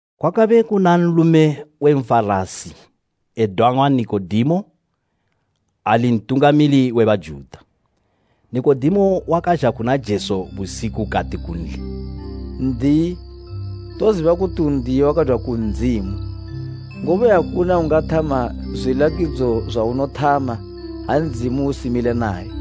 Kwakabe kuna nlume we Nfarasi edang'wa Nikodemo, ali ntungamili we Bajuta. Nikodemo wakazha kuna Jesu busiku kati kunli, “N'diyi, toziba kuti u n'diyi wakadwa ku Ndzimu, ngobe akuna ungathama zwilakidzo zwaunothama ha Ndzimu usimile naye.”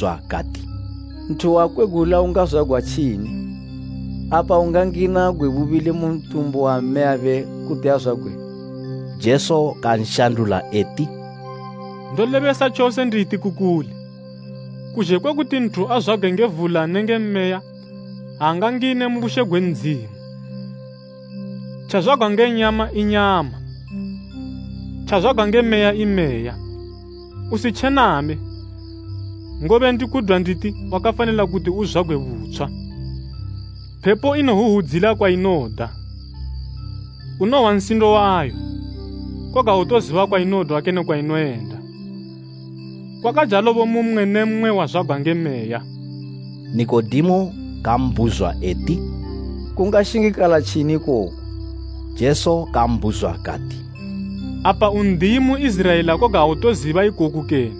Nikodemo kabhuzwa kati, “Nthu wakwegula ungazwagwa tjini? Apa ungangina gwe bubili mu ntumbu wa mmeyabe kuti azwagwe?” Jesu kanshandula eti, “Ndolebesa tjose nditi ku kuli, kuzhe kwe kuti nthu azwagwe nge vula nenge meya, aangangine mu bushe gwe Ndzimu. Tjazwagwa nge nyama i nyama, tjazwagwa nge Meya i meya. Usitjename, ngobe ndikudwa nditi wakafanila kuti uzwagwe butshwa. Phepo inohwuhwudzila kwainoda, unohwa nsindo wayo, koga autoziba kwainodwa kene kwainoyenda. Kwakajalobo mu mmwe ne mmwe wazwagwa nge Meya.” Nikodemo kambhuzwa eti, “Kungashingikala tjini ikoku?” Jesu kambhuzwa kati, “Apa u n'diyi mu Iziraela koga autoziba ikoku kene?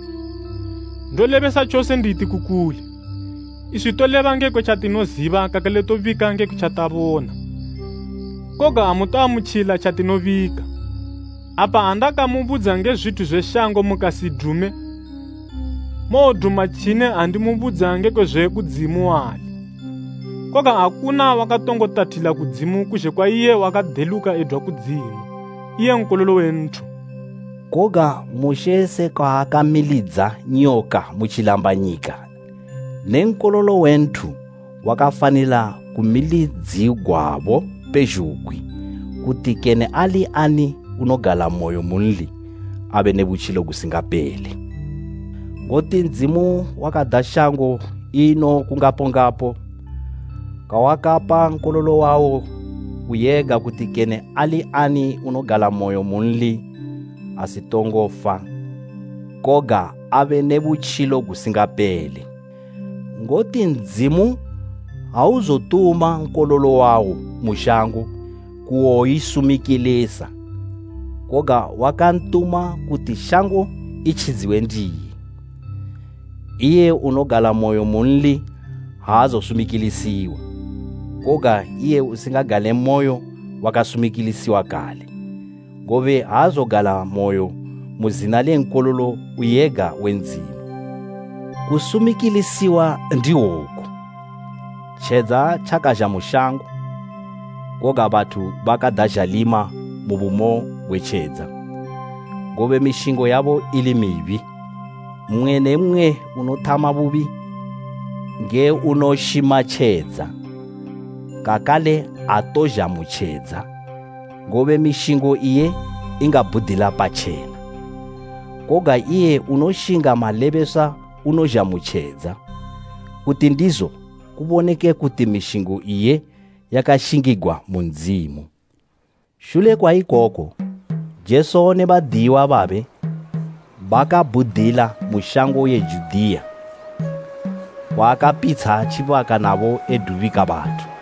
Ndolebesa tjose nditi ku kuli, iswi toleba ngekwe tjatinoziba kakale tobika ngekwe tjatakabona, koga amutoamutjila tjatinobika. Apa ha ndakamubudza nge zwithu zwe shango mukasidume, mowoduma tjini ha ndimubudza ngekwe zwe kudzimu wali? Koga akuna wakatongo tathilila kudzimu kuzhe kwa iye wakadeluka edwa kudzimu, iye Nkololo we nthu.” Koga Mushe sekwa akamilidza nyoka mu tjilambanyika ne Nkololo we nthu wakafanila kumilidzigwabo pezhugwi, kuti kene ali ani unogalamoyo munli abe ne butjilo gusingapele. Ngoti Ndzimu wakada shango ino kungapongapo kwawakapa Nkololo wawo uyega kuti kene ali ani unogalamoyo munli asitongofa, koga abe ne butjilo gusingapele. Ngoti Ndzimu auzotuma Nkololo wawo mu shango kuwoyisumikilisa, koga wakantuma kuti shango itjidziwe ndiye. Iye unogalamoyo munli aazosumikilisiwa, koga iye usingagalemoyo wakasumikilisiwa kale, ngobe aazogalamoyo mu zina le Nkololo uyega we Ndzimu. Kusumikilisiwa ndihwoku, tjedza tjakazha mu shango, koga bathu bakada zhalima mu bumo gwe tjedza, ngobe mishingo yabo ili mibi. Mmwe ne mmwe unothama bubi nge unobenga tjedza, kakale aatozha mu tjedza, ngobe mishingo iye ingabhudila patjena. Koga iye unoshinga malebeswa unozha mu tjedza kuti ndizo kuboneke kuti mishingo iye yakashingigwa mu Ndzimu. Shule kwa ikoko, Jesu ne badiyiwa babe bakabhudila mu shango ye Judiya, kwaakapitsha tjibaka nabo edubika bathu.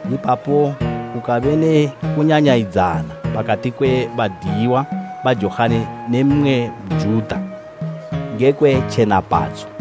Ipapo kukabe ne kunyanyayidzana pakati kwe badiyiwa ba Johani ne mmwe Njuta ngekwe tjenapadzo.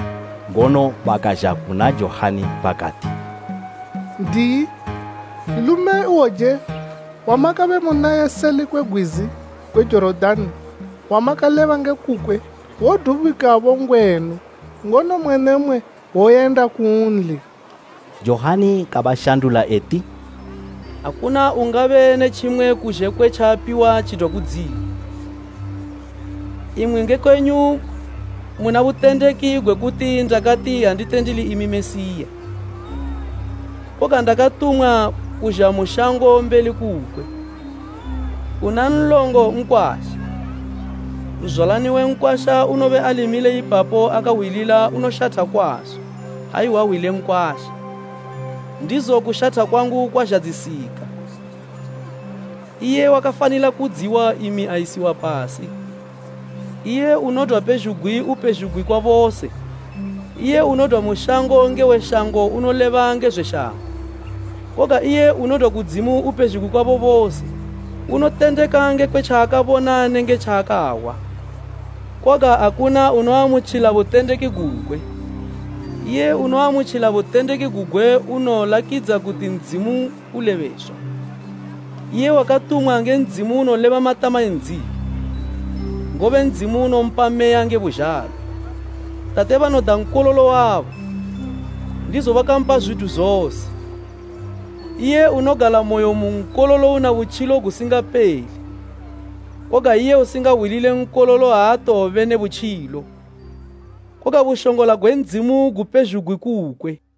Ngono bakazha kuna Johani bakati, “N'diyi, nlume ihwouje wamakabe munaye seli kwe gwizi gwe Jorodani wamakaleba nge kukwe, wodubikabo ngwenu, ngono mmwe ne mmwe woyenda kunli.” Johani kabashandula eti, “Akuna ungabe ne tjimwe kuzhe kwe tjaapiwa tjidwa kudzimu. Imwi nge kwenyu muna butendeki gwe kuti ndakati, ‘Andite ndili imi Mesiya, koga ndakatumwa kuzha mu shango mbeli kukwe.’ Una nlongo nkwasha, nzwalani we nkwasha unobe ali mile ipapo akahwilila unoshatha kwazo ha ehwa hwi le nkwasha. Ndizo kushatha kwangu kwazhadzisika. Iye wakafanila kudziwa, imi ayisiwa pasi.” Iye unodwa pezhugwi upezhugwi kwa bose. Iye unodwa mu shango nge we shango unoleba nge zwe shango, koga iye unodwa kudzimu upezhugwi kwabo bose. Unotendeka ngekwe tjaakabona nenge tjaakahwa, koga akuna unoamutjila butendeki gugwe. Iye unoamutjila butendeki gugwe unolakidza kuti Ndzimu ulebeswa. Iye wakatumwa nge Ndzimu unoleba matama e Ndzimu, ngobe Ndzimu unompa Meya nge buzhalo. Tate banoda Nkololo wabo, ndizo bakampa zwithu zose. Iye unogalamoyo mu Nkololo una butjilo gusingapele, koga iye usingahwilile Nkololo aatowobe ne butjilo, koga bushongola gwe Ndzimu gupezhugwi kukwe.